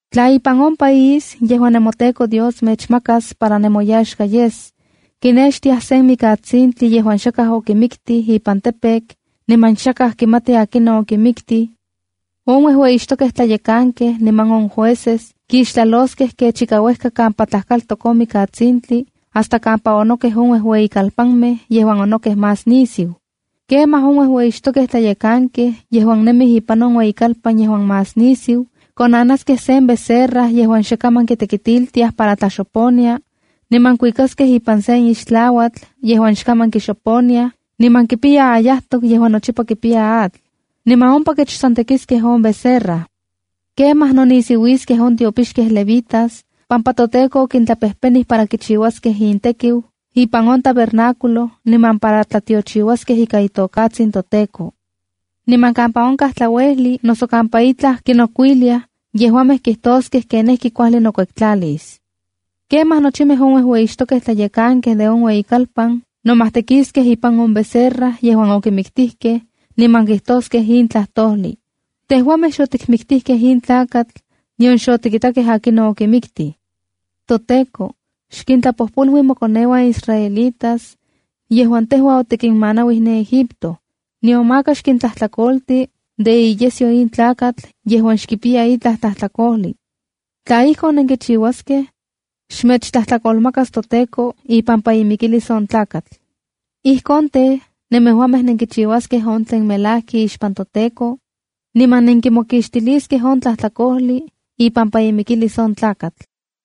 ’Tla ipan on país yejuan nemoTEKO Dios mechmakas para nemoyaxka yes, kinextiaj sen mikatsintli yejuan yakaj okimiktij ipan campo niman xakaj kimati akinon okimiktij, on uejueyixtokej tlayekankej niman on jueces kixtlaloskej kech ika uejka kampa tlajkaltok on mikatsintli hasta kampa onokej on uejueyikalpanmej yejuan onokej más nisiu. Kemaj on uejueyixtokej tlayekankej yejuan nemij ipan on ueyikalpan yejuan más nisiu, konanaskej sen becerra yejuan xe kaman kitekitiltiaj para tlaxoponia, niman kuikaskej ipan sen ixtlauatl yejuan xkaman kixoponiaj niman kipiya ayajtok yejuan nochipa kipiya atl. Niman ompa kechtsontekiskej on becerra. ’Kemaj nonisiuiskej on tiopixkej levitas pampa toTEKO okintlapejpenij para kichiuaskej intekiu ipan on tabernáculo niman para tlatiochiuaskej ikan itokatsin toTEKO. Niman kampa onkaj tlauejli noso kampa itlaj kinokuiliaj, yejuamej kijtoskej kenijki kuajli nokuektlalis. Kemaj nochimej on uejueyixtokej tlayekankej de on ueyikalpan nomajtekiskej ipan on becerra yejuan okimiktijkej, niman kijtoskej in tlajtojlij: “Tejuamej xotikmiktijkej in tlakatl, nion xotikitakej akinon okimiktij. ToTEKO, xkintlapojpolui mokoneuan israelitas, yejuan tejua otikinmanauij ne Egipto. Niman maka xkintlajtlakolti de iyesyo in tlakatl yejuan xkipiya itlaj tlajtlakojli.” Tla ijkon, nenkichiuaskej, xmechtlajtlakolmakas toTEKO ipampa imikilis on tlakatl. Ijkon tej, nemejuamej nenkichiuaskej on tlen melajki ixpan toTEKO, niman nenkimokixtiliskej on tlajtlakojli ipampa imikilis on tlakatl.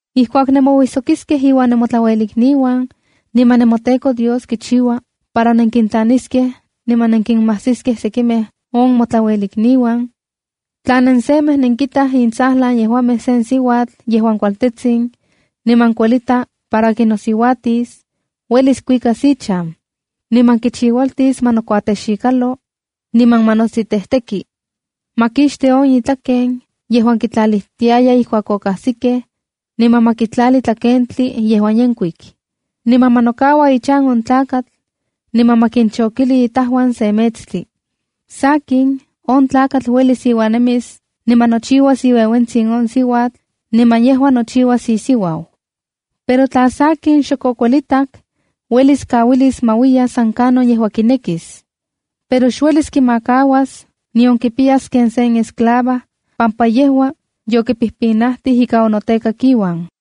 ’Ijkuak nemouijsokiskej iuan nemotlauelikniuan, niman nemoTEKO Dios kichiua para nenkintlaniskej niman nenkinmajsiskej sekimej on motlauelikniuan, tla nensemej nenkitaj intsajlan yejuamej sen siuatl yejuan kualtetsin, niman kuelita para kinosiuatis, uelis kuikas ichan. Niman kichiualtis ma nokuatexikalo, niman ma nostitejteki. Ma kixti on itlaken yejuan kitlalijtiaya ijkuak okajsikej, niman ma kitlali tlakentli yejuan yenkuik. Niman ma nokaua ichan on tlakatl, niman ma kinchokili itajuan se metstli. Sakin, on tlakatl uelis iuan nemis niman nochiuas iueuentsin on siuatl niman yejua nochiuas isiuau. Pero tla sakin xok okuelitak, uelis kauilis ma uiya san kanon yejua kinekis. Pero xuelis kinamakas nion kipiyas ken sen esclava pampa yejua yokipijpinajtij ika onotekak iuan.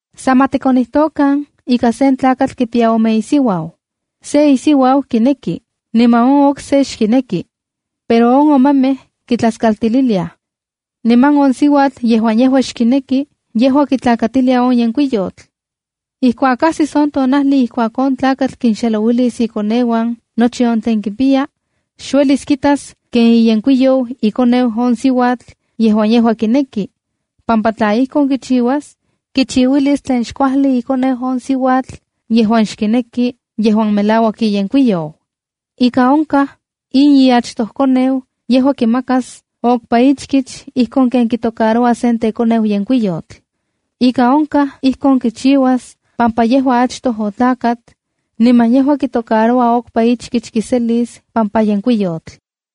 “San ma tikonijtokan ika sen tlakatl kipiya ome isiuau. Se isiuau kineki niman on okse xkineki. Pero on omemej kitlaskaltililiaj, niman on siuatl yejuan yejua xkineki yejua kitlakatilia on yenkuiyotl. Ijkuak ajsis on tonajli ijkuak on tlakatl kinxelouilis ikoneuan nochi on tlen kipiya, xuelis kitas ken iyenkuiyou ikoneu on siuatl yejuan yejua kineki. Pampa tla ijkon kichiuas, kichiuilis tlen xkuajli ikoneu on siuatl yejuan xkineki yejuan melauak iyenkuiyou. Ika onkaj, in iachtojkoneu yejua kimakas okpa ichkich ijkon ken kitocaroua sen tekoneu yenkuiyotl. Ika onkaj ijkon kichiuas pampa yejua achtoj otlakat, niman yejua kitocaroua okpa ichkich kiselis pampa yenkuiyotl.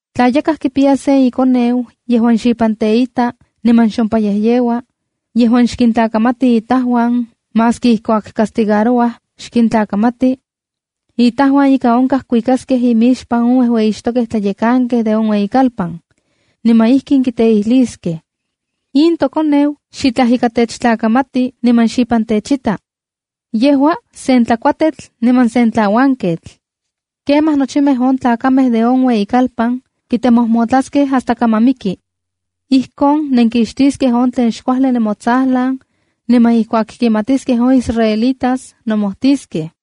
“Tla yakaj kipiya sen ikoneu yejuan xipan teita niman xompayejyeua, yejuan xkintlakamati itajuan maski ijkuak castigarouaj xkintlakamati, itajuan ika onkaj kuikaskej imixpan on uejueyixtokej tlayekankej de on ueyikalpan. Niman ijkin kiteijliskej: “In tokoneu xitlaj ika techtlakamati, niman xipan techita. Yejua sen tlakuatetl niman sen tlauanketl.” Kemaj nochimej on tlakamej de on ueyikalpan kitemojmotlaskej hasta kaman miki. Ijkon nenkixtiskej on tlen xkuajli nemotsajlan, niman ijkuak kimatiskej on israelitas nomojtiskej.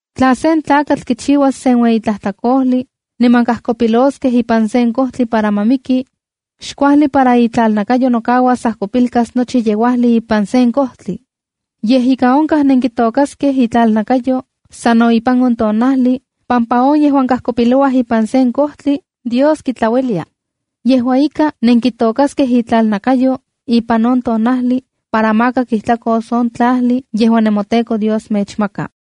’Tla sen tlakatl kichiuas sen ueyi tlajtlakojli niman kajkopiloskej ipan sen kojtli para ma miki, xkuajli para itlalnakayo nokauas ajkopilkas nochi yeuajli ipan sen kojtli. Yej ika onka nenkitokaskej itlalnakayo sano ipan on tonajli pampa on yejuan kajkopilouaj ipan sen kojtli Dios kitlaulia. Yejua ika, nenkitokaskej itlalnakayo ipan on tonajli para maka kijtlakos on tlajli yejuan nemoTEKO Dios mechmaka.